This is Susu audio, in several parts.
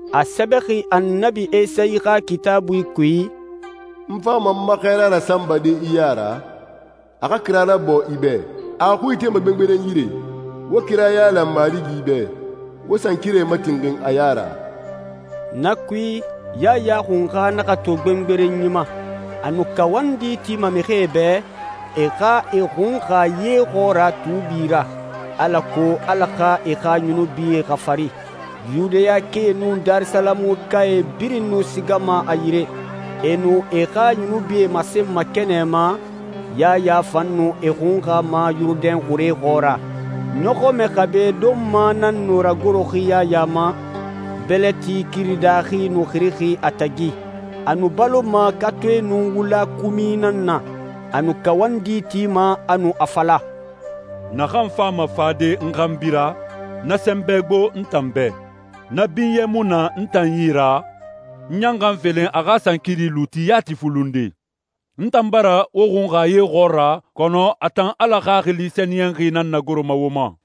A sɛbɛxi Annabi Esayi xa Kitaabui kui, «N fama n ma xɛɛra rasanbade i ya ra, a xa kira rabɔɔ i bɛ. A a xui itema gbengberen yire, ‹Wo kira yailan Marigi bɛ, wo sankirae matinxin a ya ra.›» Na kui, Yaya Xunxa naxa to gbengberenyi ma. A nu kawandi tima mixie bɛ, e xa e xunxa ye xɔɔra tuubi ra, alako Ala xa e xa yunubie xafari. Yudayakae nun Darisalamuka birin nu sigama a yire. E nu e xa yunubie masenma kɛnɛ ma, Yaya fan nu e xunxama Yurudɛn xure xɔɔra. Ɲɔxɔmɛ xabe donma nan nu ragoroxi Yaya ma, bɛlɛti kiri daaxi nu xirixi a tagi. A nu baloma katoe nun wula kumi nan na. A nu kawandi tima, a nu a fala, «Naxan fama fade n xanbi ra, na sɛnbɛ gbo n tan bɛ. Na binyɛ mu na n tan yi ra, n ɲan xa n felen a xa sankiri luuti yati fulunde. N tan bara wo xunxa ye xɔɔra, kɔnɔ a tan Ala Xaxili Sɛniyɛnxi nan nagoroma wo ma.»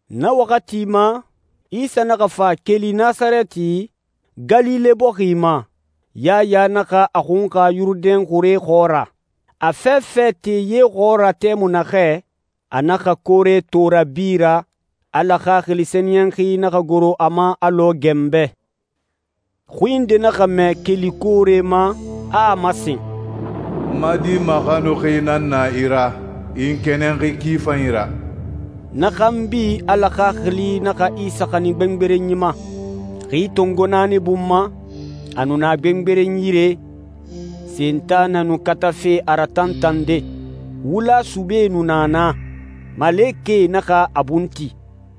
Na waxati ma, Isa naxa fa keli Nasarɛti, Galile bɔxi ma, Yaya naxa a xunxa Yurudɛn xure xɔɔra. A fɛfɛ te ye xɔɔra tɛmui naxɛ, a naxa koore to rabi ra, Ala Xaxili Sɛniyɛnxi naxa goro a ma alɔ ganbɛ. Xui nde naxa mɛ keli koore ma, a a masen, «N ma Di maxanuxi nan na i ra. I n kɛnɛnxi ki fanyi ra.» Na xanbi Ala Xaxili naxa Isa xanin gbengberenyi ma. Xi tongo naani bun ma, a nu na gbengberen yire, Sentanɛ nu katafe a ratantande. Wula subee nu na naa. Malekɛe naxa a bun ti.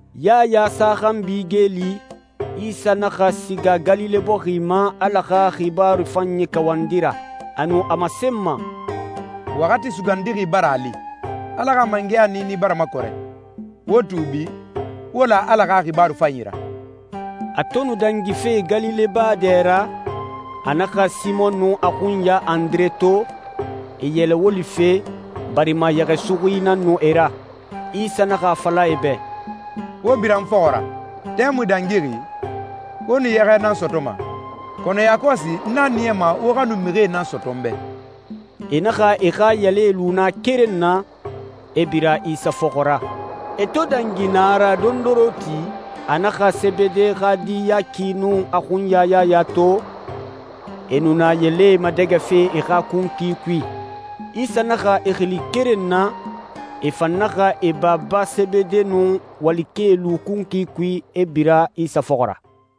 Yaya sa xanbi geeli, Isa naxa siga Galile bɔxi ma Ala xa xibaaru fanyi kawandi ra. A nu a masenma, «Waxati sugandixi bara a li, Ala xa mangɛya niini bara makɔrɛ. Wo tuubi, wo la Ala xa xibaaru fanyi ra.» A to nu dangife Galile baa dɛ ra, a naxa Simɔn nun a xunya Andire to, e yɛlɛ wolife, barima yɛxɛsuxuie nan nu e ra. Isa naxa a fala e bɛ, «Wo bira n fɔxɔ ra. Tɛmui dangixi, wo nu yɛxɛ nan sɔtɔma, kɔnɔ yakɔsi n a niyama wo xa nu mixie nan sɔtɔ n bɛ.» E naxa e xa yɛlɛe lu na keren na, e bira Isa fɔxɔ ra. E to dangi na ra dondoronti, a naxa Sebede xa di Yaki nun a xunya Yaya to, e nu na yɛlɛe madɛgɛfe e xa kunkui kui. Isa naxa e xili keren na, e fan naxa e baba Sebede nun walikɛe lu kunkui kui, e bira Isa fɔxɔ ra.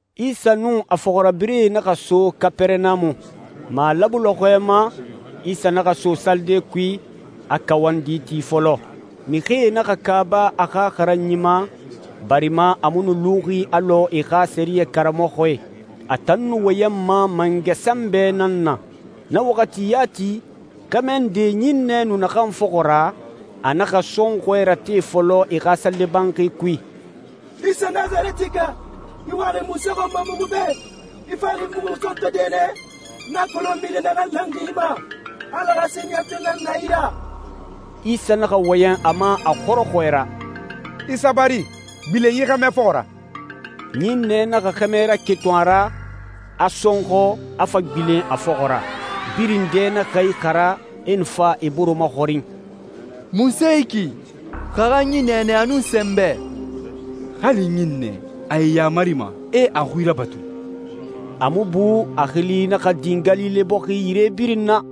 Isa nun a fɔxirabirɛe naxa so Kapɛrɛnamu. Malabu lɔxɔɛ ma, Isa naxa so salide kui, a kawandi ti fɔlɔ. Mixie naxa kaaba a xa xaranyi ma, barima a mu nu luxi alɔ e xa sɛriyɛ karamɔxɔe. A tan nu wɔyɛnma mangɛ sɛnbɛ nan na. Na waxati yati, xɛmɛ nde ɲinnɛ nu naxan fɔxɔ ra, a naxa sɔnxɔɛ rate fɔlɔ e xa salide banxi kui, «Isa Nasarɛtika, i waxi munse xɔn ma muxu bɛ? I faxi muxu sɔntɔde nɛ? N a kolon mixi naxan lanxi i ma. Ala xa Sɛniyɛntɔɛ nan na i ra.» Isa naxa wɔyɛn a ma a xɔrɔxɔɛ ra, «I sabari. Gbilen yi xɛmɛ fɔxɔ ra.» Ɲinnɛ naxa xɛmɛ raketun a ra, a sɔnxɔ, a fa gbilen a fɔxɔ ra. Birin dɛ naxa ixara, e nu fa e bore maxɔrin, «Munse yi ki? Xaranyi nɛɛnɛ a nun sɛnbɛ! Hali ɲinnɛe, a e yamarima, e a xui rabatu.» A mu bu, a xili naxa din Galile bɔxi yire birin na.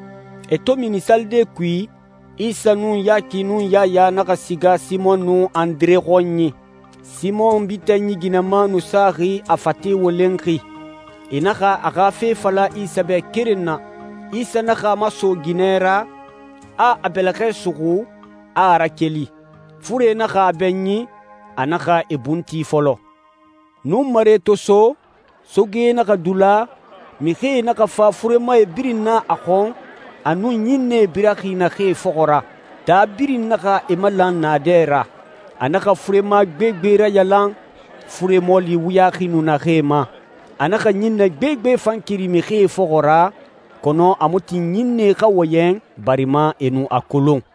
E to mini salide kui, Isa nun Yaki nun Yaya naxa siga Simɔn nun Andire xɔnyi. Simɔn bitanyi ginɛma nu saxi, a fate wolenxi. E naxa a xa fe fala Isa bɛ keren na. Isa naxa a maso ginɛ ra, a a bɛlɛxɛ suxu, a a rakeli. Fure naxa a bɛɲin, a naxa e bun ti fɔlɔ. Nunmare to so, soge naxa dula, mixie naxa fa furemae birin na a xɔn, a nun ɲinnɛe biraxi naxee fɔxɔ ra. Taa birin naxa e malan naadɛ ra. A naxa furema gbegbe rayalan, fure mɔɔli wuyaxi nu naxee ma. A naxa ɲinnɛ gbegbe fan keri mixie fɔxɔ ra, kɔnɔ a mu tin ɲinnɛe xa wɔyɛn, barima e nu a kolon.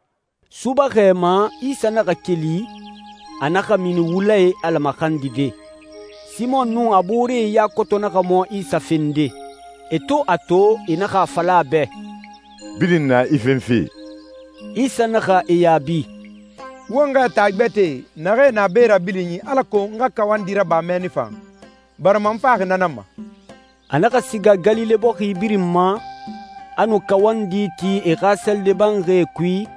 Subaxɛ ma, Isa naxa keli, a naxa mini wula i Ala maxandide. Simɔn nun a booree ya koto naxa mɔ Isa fende. E to a to, e naxa a fala a bɛ, «Birin na i fenfe.» Isa naxa e yaabi, «Won xɛɛ taa gbɛtɛe naxee na be rabilinyi alako n xa kawandi raba mɛnni fan, barima n faxi na nan ma.» A naxa siga Galile bɔxi birin ma, a nu kawandi ti e xa salide banxie kui,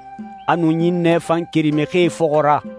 a nu ɲinnɛe fan keri mixie fɔxɔ ra.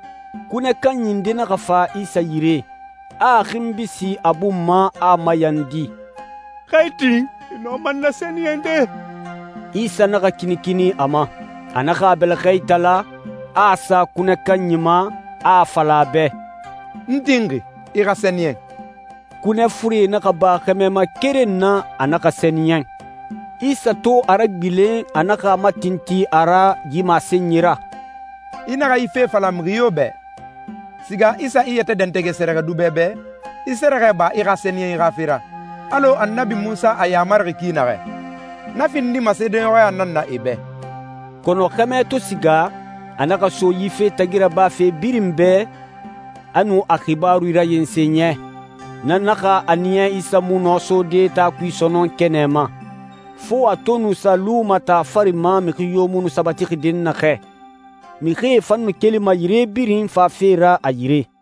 Kunɛ kanyi nde naxa fa Isa yire, a a xinbi sin a bun ma, a a mayandi, «Xa i tin, i nɔma n nasɛniyɛnde.» Isa naxa kinikini a ma. A naxa a bɛlɛxɛ itala, a a sa kunɛ kanyi ma, a a fala a bɛ, «N tinxi. I xa sɛniyɛn.» Kunɛ fure naxa ba xɛmɛ ma keren na, a naxa sɛniyɛn. Isa to a ragbilen, a naxa a matintin a ra yi masenyi ra, «I naxa yi fe fala mixi yo bɛ. Siga i sa i yɛtɛ dɛntɛgɛ sɛrɛxɛdubɛ bɛ, i sɛrɛxɛ ba i xa sɛniyɛnyi xa fe ra, alɔ Annabi Munsa a yamarixi ki naxɛ. Na findima seedeɲɔxɔya nan na e bɛ.» Kɔnɔ xɛmɛ to siga, a naxa so yi fe tagi rabafe birin bɛ, a nu a xibaaru rayensen yɛ. Na naxa a niya Isa mu nɔ sode taa kui sɔnɔn kɛnɛ ma. Fo a to nu sa luma taa fari ma mixi yo mu sabatixi dɛnnaxɛ. Mixie fan nu kelima yire birin fafe ra a yire.